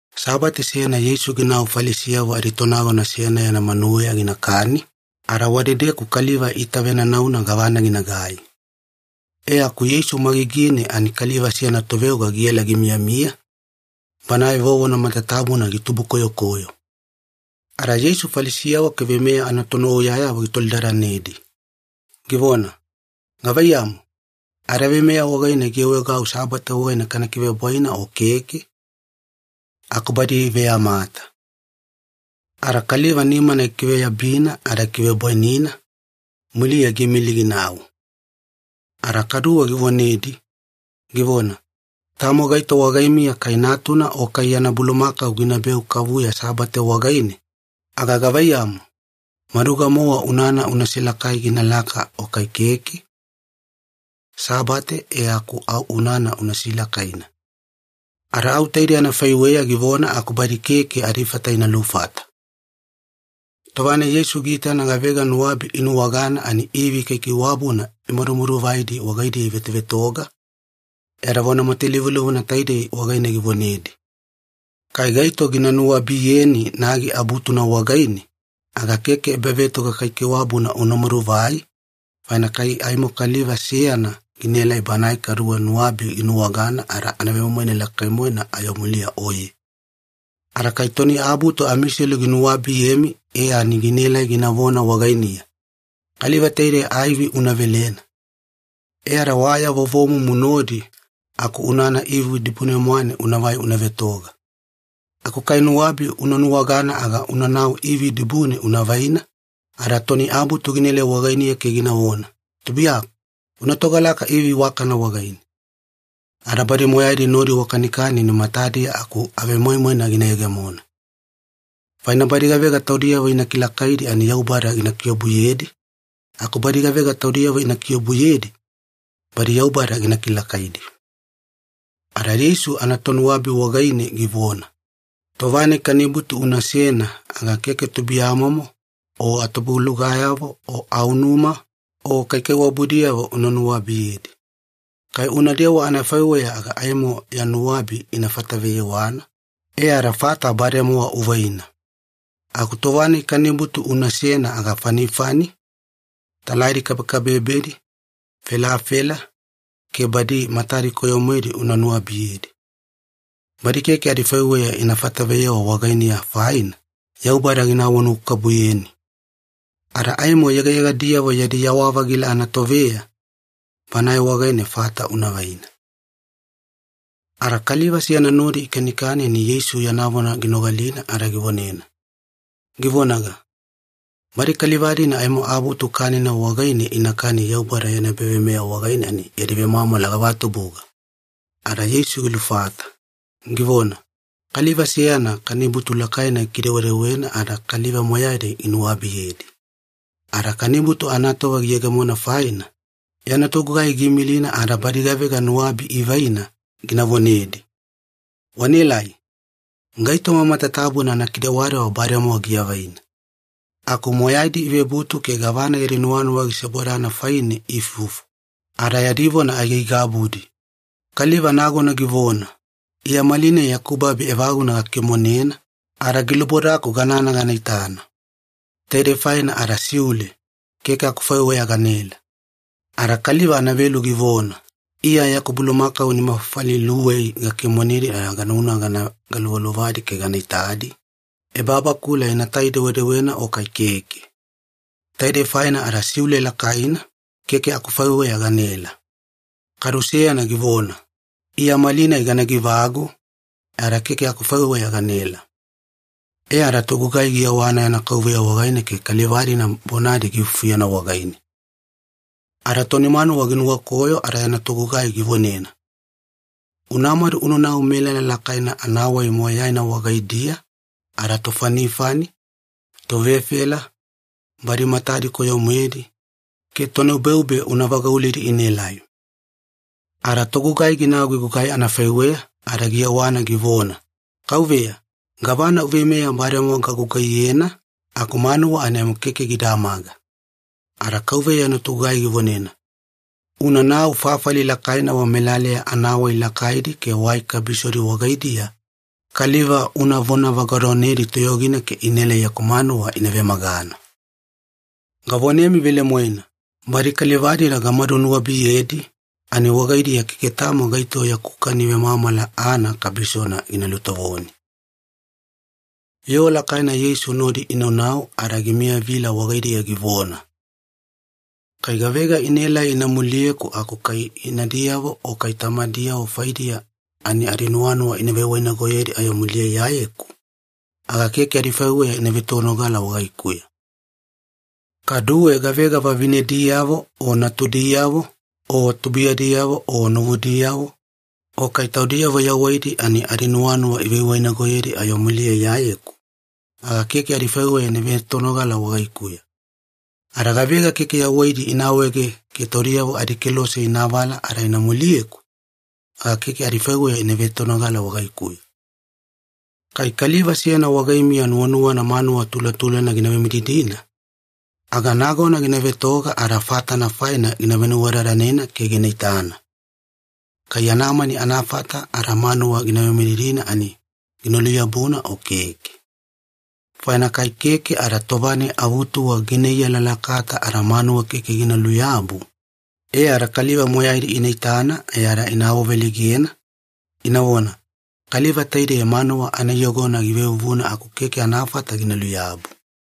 Sabate seyana Yeisu ginau Falisiyavo aditonagona seyana yana manuweya ginakani, ada wadedeku kaliva iitavenanauna gavana ginagai. E aku Yeisu magigine ani kaliva seyana toveoga giela gimiyamiya, banae vovona matatabuna gitubukoyokoyo. Ada Yeisu Falisiyavo ke veimeya anatonuwauyayavo gitolidadanedi, givona, “Gavaiyamu, adaveimeya wagaine giawaegau Sabate wagaine kana kivebwaina o keke?” Aku badi iveyamata. Ada kaliva nimana gikiveyabina ada gikivebwainina, muliya giimili ginau. Ada kaduwe givonedi, givona, “Tamo gaito wagaimiya kai natuna o kai yana bulumakau ginabeu kavuya Sabate wagaine, aga gavaiyamu, maduga-mowa unana una silakai ginalaka o kai keke? Sabate e aku au unana una silakaina.” Ada au taidei anafaiweya givona aku badi keke adifata ina lufata. Tova-nai Yeisu giitana gavega nuwabi inuwagana ani ivi kaikaiwabuna imadumaduvaidi wagaidiya ivetovetoga, e ada vona matalivulivuna taidei wagaine givonedi, “Kai gaito gina nuwabiyeni nagi abutuna wagaine, aga keke ebavetoga kaikaiwabuna una maduvai, faina kai aimo kaliva seyana ginaelai banae kaduwe nuwabi ginuwagana ada anavemoimoina lakai-moena ayo muliya oye. Ada kai toni abutu amiselu ginuwabiyemi e ani ginaela ginavona wagainiya, ‘Kaliva taidei aivi una velena.’ E ada wa ya vovomumu nodi aku unana ivi dibune-mwane unavai una vetoga. Aku kai nuwabi una nuwagana aga unanau ivi dibune una vaina, ada toni abutu ginaelai wagainiya ke ginavona, ‘Tubuiyaku, una togalaka ivi iwakana wagaine.’ Ada badi moyaidi nodi wakanikani ani matadiya aku avemoimoina gina yegemona. Faina badi gavega taudiyavo ina kilakaidi ani Yaubada gina kiobuyedi, aku badi gavega taudiyavo ina kiobuyedi, badi Yaubada gina kilakaidi.” Ada Yeisu anatonuwabi wagaine givona, “Tova-nai kanibutu unasena aga keke tubuiyamomo o atubulugayavo o aunuma o kaikaiwabudiyavo una nuwabiyedi. Kai unadewa anafaiweya aga aimo ya nuwabi ina fataveyewana, e ada fata bademowa uvaina. Aku tova-nai kanibutu unasena aga fanifani, talaidi kabekabebedi, felafela, ke badi matadi koyo-moedi una nuwabiyedi. Badi keke adifaiweya ina fataveyewa wagainiya faina, Yaubada gina awanuwakabubuyeni. Ada aimo yegayegadiyavo yadi yawa-vagila anatoveya, Banae wagaine fata una vaina.” Ada kaliva seyana nodi ikanikani ani Yeisu yana vona ginogalina ada givonena, givonaga, “Badi kaliva-dina aimo abutu kanina wagaine inakani Yaubada yana ebaveimeya wagaine ani yadi vemwamwala gavatubuga!” Ada Yeisu gilufata, givona, “Kaliva seyana kanibutu lakaina gikidewedewena ada kaliva moyaidi ginuwabiyedi. Ada kanibutu anatova giyegemona faina, yana togugai giimilina ada badi gavega nuwabi ivaina gina vonedi, ‘Wanaelai! Gaitoma matatabuna anakidewadewa bademowa giavaina.’ “Aku moyaidi ivebutu ke gavana yadi nuwanuwa gisebodana faine iifufu, ada yadi vona aigaigabudi. Kaliva nagona givona, ‘Iya malinai yaku babi evaguna gakimonena, ada gilubodaku ganana gana itana. Taidei faina ada siule, keke akufaiweya ganaela.’ “Ada kaliva anavelu givona, ‘Iya yaku bulumakau nima fafali iluwei gakimonedi ada ganauna gana galuvaluvadi ke gana itadi, ebabakula inatai-dewedewena o kai keke. Taidei faina ada siule lakaina, keke akufaiweya ganaela.’ “Kadu seyana givona, ‘Iya malinai ganagi-vagu, e ada keke akufaiweya ganaela.’ “E ada togugai giyewana yana kauveya wagaine ke kaliva-dina bonadi giifufuyena wagaine. Ada toni manuwa ginuwakoyo ada yana togugai givonena, ‘Unamadu unanau melala lakaina anawai moyaina wagaidiya ada tofanifani, tovefela, badi matadi koyo-moedi, ke tonubeube una vagauledi inaelai.’ “Ada togugai ginau gigugai anafaiweya, ada giyewana givona, ‘Kauveya, gavana uveimeya bademowa gagugaiyena, aku manuwa ani aimo keke gidamaga.’ “Ada kauveya yana togugai givonena, ‘Unanau fafali lakaina wamelaleya anawai lakaidi ke wai kabisodi wagaidiya kaliva una vonavagadonedi toyogina ke inaela yaku manuwa ina vemagana. Gavonemi velemoena, badi kaliva-dina gamadu nuwabiyedi, ani wagaidiya keke tamo gaito yaku kani vemwamwala aana kabisona gina lutovoni.’” Yoo lakaina Yeisu nodi inaunau ada gimiyavila wagaidiya givona, “Kai gavega inaela ina muliyeku aku kai inadiyavo o kai tamadiyavo faidiya ani adinuwanuwa ivewainagoyedi ayo muliya Iyayeku, aga keke adifaiweya ina vetonogala wagaikuya. Kaduwe gavega vavinediyavo o natudiyavo, o tubuiyadiyavo o novudiyavo, o kai taudiyavo yawaidi ani adinuwanuwa ivewainagoyedi ayo muliya Iyayeku, aga keke adifaiweya ina vetonogala wagaikuya. Ada gavega keke yawaidi ina awaege ke taudiyavo adikelose ina avala ada ina muliyeku, aga keke adifaiweya ina vetonogala wagaikuya. “Kai kaliva seyana wagaimiya nuwanuwana manuwa tulatulana gina vemididina, aga nagona gina vetoga ada fatana faina gina venuwadadanena ke gina itana, kai yana mani anafata ada manuwa gina vemididina ani gina luyabuna o keke. Faina kai keke ada tova-nai avutuwa gina iyalalakata ada manuwa keke gina luyabu, e ada kaliva moyaidi ina itana ada ina awaveleigena, inavona, ‘Kaliva taidei manuwa anaiyogona givevuvuna aku keke anafata gina luyabu.’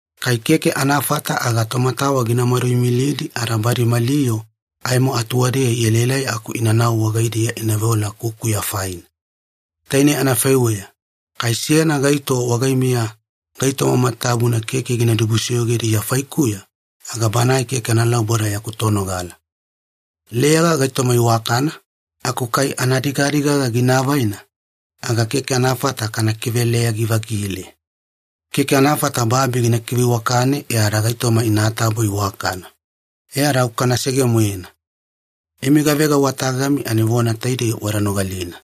Kai keke anafata aga tomatawa gina maduimilidi ada badi mali yoo aimo atuwadeya ielaelai aku inanau wagaidiya ina veola kukuya faina. Tainei anafaiweya, kai seyana gaito wagaimiya gaitoma matatabuna keke gina dibusoyogedi Iya faikuya, aga banae keke analauboda yaku tonogala. “Leyaga gaitoma iwakana, aku kai anadigadigaga gina avaina, aga keke anafata kana kiveleyagi-vagile. Keke anafata babi gina kiveiwakane e ada gaitoma inatabo iwakana, e ada au kanasege-moena. “Imi gavega wa tagami ani vona taidei wada nogalina.”